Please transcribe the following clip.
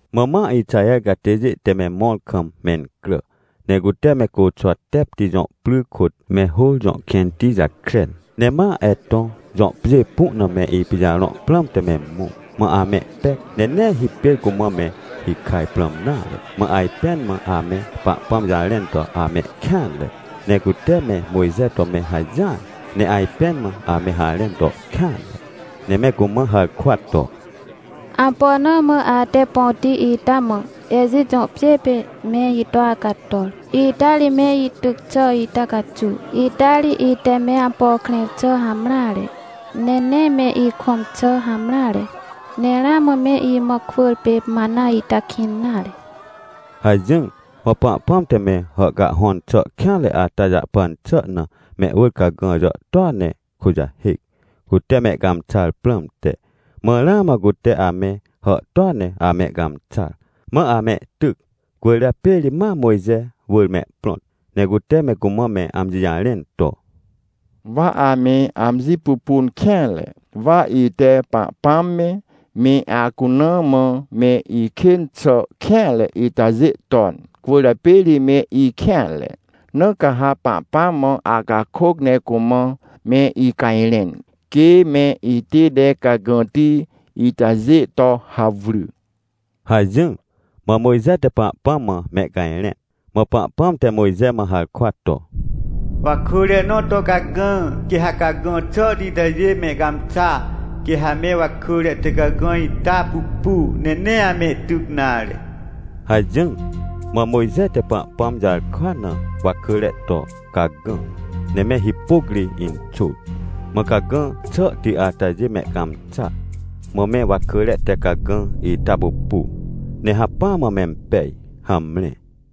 Mã ma Ixaher catêjê te me mõr kam mencrà, ne cute me Côxwatepti jõ pry kôt, me Hôr jõ kẽnti jakren. Ne ma Etõ jõ pjê pu na me ipijarõ prãmte me mõ. Mã amehpec ne nee hipêr cumã me hikaj prãm nare, mã ajpẽn mã ame Pahpãm jarẽn to amehkêanre, ne cute me Mojxe to me hajỹar, ne ajpẽn mã ame harẽn to kêanre, ne me cumã harkwa to: — Ampo na mã ate põti ita mã, Ejit jõ pjê pê me ito acator, ita ri me ityc xà ita caxuw? Ita ri ite me ampo krẽr xà hamreare, ne nee me ikõm xà hamreare. Ne ramã me imã kwỳr pê mana ita kĩn nare — hajỹr. Mã Pahpãm te me hàhcahhõn xà kêanre ata jahpan xà na, mehwỳr cagã jàhtôa ne kujahêc, cute mehcãmxar prãmte. Mã ramã cute ame hàhtôa ne amehcãmxar, mã amehtyc. Cwỳrjapê ri ma Mojxe wỳr mehprõt, ne cute me cumã me amji jarẽn to: — Wa ame amji pupun kêanre! Wa ite Pahpãm me, me acuna mã me ikên xà kêanre itajê ton, cwỳrjapê ri me ikêanre. Na ca ha Pahpãm mã acakôc, ne cumã me icajrẽn, quê me itête cagãti itajê to hawry — hajỹr. Mã Mojxe te Pahpãm mã mehcajrẽn. Mã Pahpãm te Mojxe mã harkwa to: — Wakỳre nõ to cagã, quê ha cagã xàhti itajê mehcãmxa, quê ha me wakỳre te cagã ita pupu, ne nee amehtyc nare — hajỹr. Mã Mojxe te Pahpãm jarkwa na wakỳre to cagã, ne me hipôc ri inxôr. Mã cagã xàhti atajê mehcãmxa, mã me wakỳre te cagã ita pupu, ne hacpỹa mã mempej. Hamre.